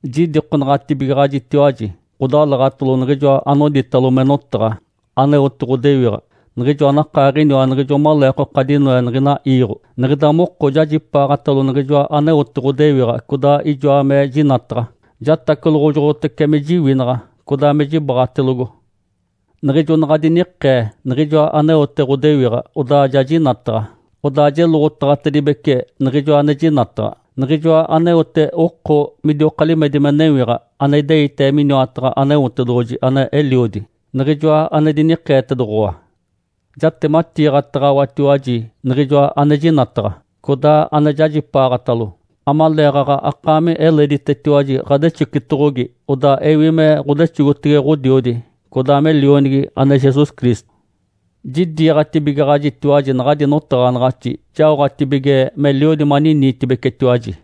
Jidikonaɡ̶atibigaɡ̶ajitiwaji, ɡ̶odalaɡ̶atalo Niɡ̶ijoa anoditalo me “Notaɡ̶a”, aneote ɡ̶odewiɡ̶a, Niɡ̶ijoa anakaaɡ̶iniwa niɡ̶ijo maleekoka dinoe niɡ̶ina iiɡ̶o. Niɡ̶ida moko jajipaaɡ̶atalo Niɡ̶ijoa aneote ɡ̶odewiɡ̶a, codaa ijoa me jinataɡ̶a. Jatacoloɡ̶ojoɡ̶otece me jiwinaɡ̶a, codaa me jibaɡ̶atelogo. Niɡ̶ijo naɡ̶a dinikee Niɡ̶ijoa aneote ɡ̶odewiɡ̶a, odaa ja jinataɡ̶a. Odaa jeloɡ̶otaɡ̶atibece Niɡ̶ijoa ane jinataɡ̶a, Niɡ̶ijoa aneote oko midioka limedi me newiɡ̶a, ane ideite miniwataɡ̶a Aneotedoɡ̶oji ane Eliodi, Niɡ̶ijoa ane dinikeetedoɡ̶owa. Jatematiiɡ̶ataɡ̶awatiwaji niɡ̶ijoa ane jinataɡ̶a, codaa ane jajipaaɡ̶atalo, amaleeɡ̶aɡ̶a akaami eleditetiwaji ɡ̶adexocitoɡ̶ogi. Odaa ewi me ɡ̶odexogotege Ǥodiodi, codaa me Lionigi ane Jesus Cristo. Jidiiɡ̶atibigaɡ̶ajitiwaji naɡ̶adi notaɡ̶anaɡ̶axi jaoɡ̶atibige meliodi maniniitibecetiwaji.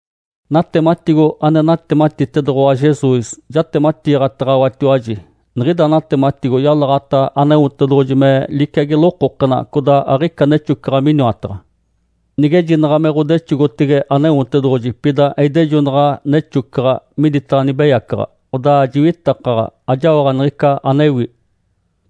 Natematigo ane natematitedoɡ̶owa Jesus, jatematiiɡ̶ataɡ̶awatiwaji. Niɡ̶ida natematigo yalaɡ̶ata Aneotedoɡ̶oji me liciagi lokokena, codaa aɡ̶ica nexocaɡ̶a miniwataɡ̶a. Nigejinaɡ̶a me ɡ̶odexogotege Aneotedoɡ̶oji, pida eidejonaɡ̶a nexocaɡ̶a miditaɡ̶a nibeyacaɡ̶a, odaa jiwitakaɡ̶a, ajaoɡ̶a niɡ̶ica anewi.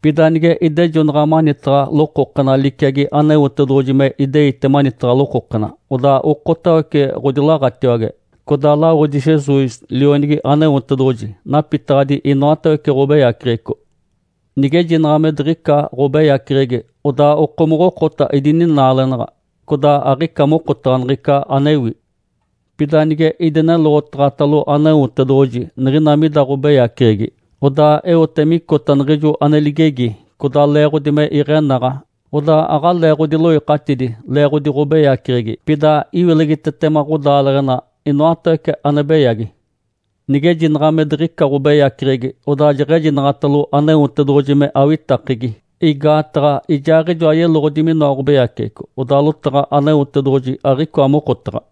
Pida nige idejonaɡ̶a manitaɡ̶a lokokena liciagi Aneotedoɡ̶oji me ideite manitaɡ̶a lokokena, odaa okotawece ɡ̶odilaɡ̶atiwage, codaa lawodi Jesus, Lionigi Aneotedoɡ̶oji, napitaɡ̶adi inoatawece ɡ̶obeyaceɡ̶eco. Nigejinaɡ̶a me diɡ̶ica ɡ̶obeyaceɡ̶egi, odaa okomoɡ̶okota idininaalenaɡ̶a, codaa aɡ̶ica mokotaɡ̶a niɡ̶ica anewi. Pida nige idineloɡ̶otaɡ̶atalo Aneotedoɡ̶oji niɡ̶ina mida ɡ̶obeyaceɡ̶egi, odaa eote micota niɡ̶ijo ane ligegi, codaa leeɡ̶odi me iɡ̶enaɡ̶a, odaa aɡ̶alee ɡ̶odiloikatidi leeɡ̶odi ɡ̶obeyaceɡ̶egi, pida iwilegitetema ɡ̶odaaleɡ̶ena inoatawece ane beyagi. Nigejinaɡ̶a me diɡ̶ica ɡ̶obeyaceɡ̶egi, odaa jeɡ̶ejinaɡ̶atalo Aneotedoɡ̶oji me awitakegi (igaataɡ̶a Ijaaɡ̶ijoa yeloɡ̶odi minoa ɡ̶obeyaceɡ̶eco), odaa lotaɡ̶a Aneotedoɡ̶oji aɡ̶icoa mokotaɡ̶a.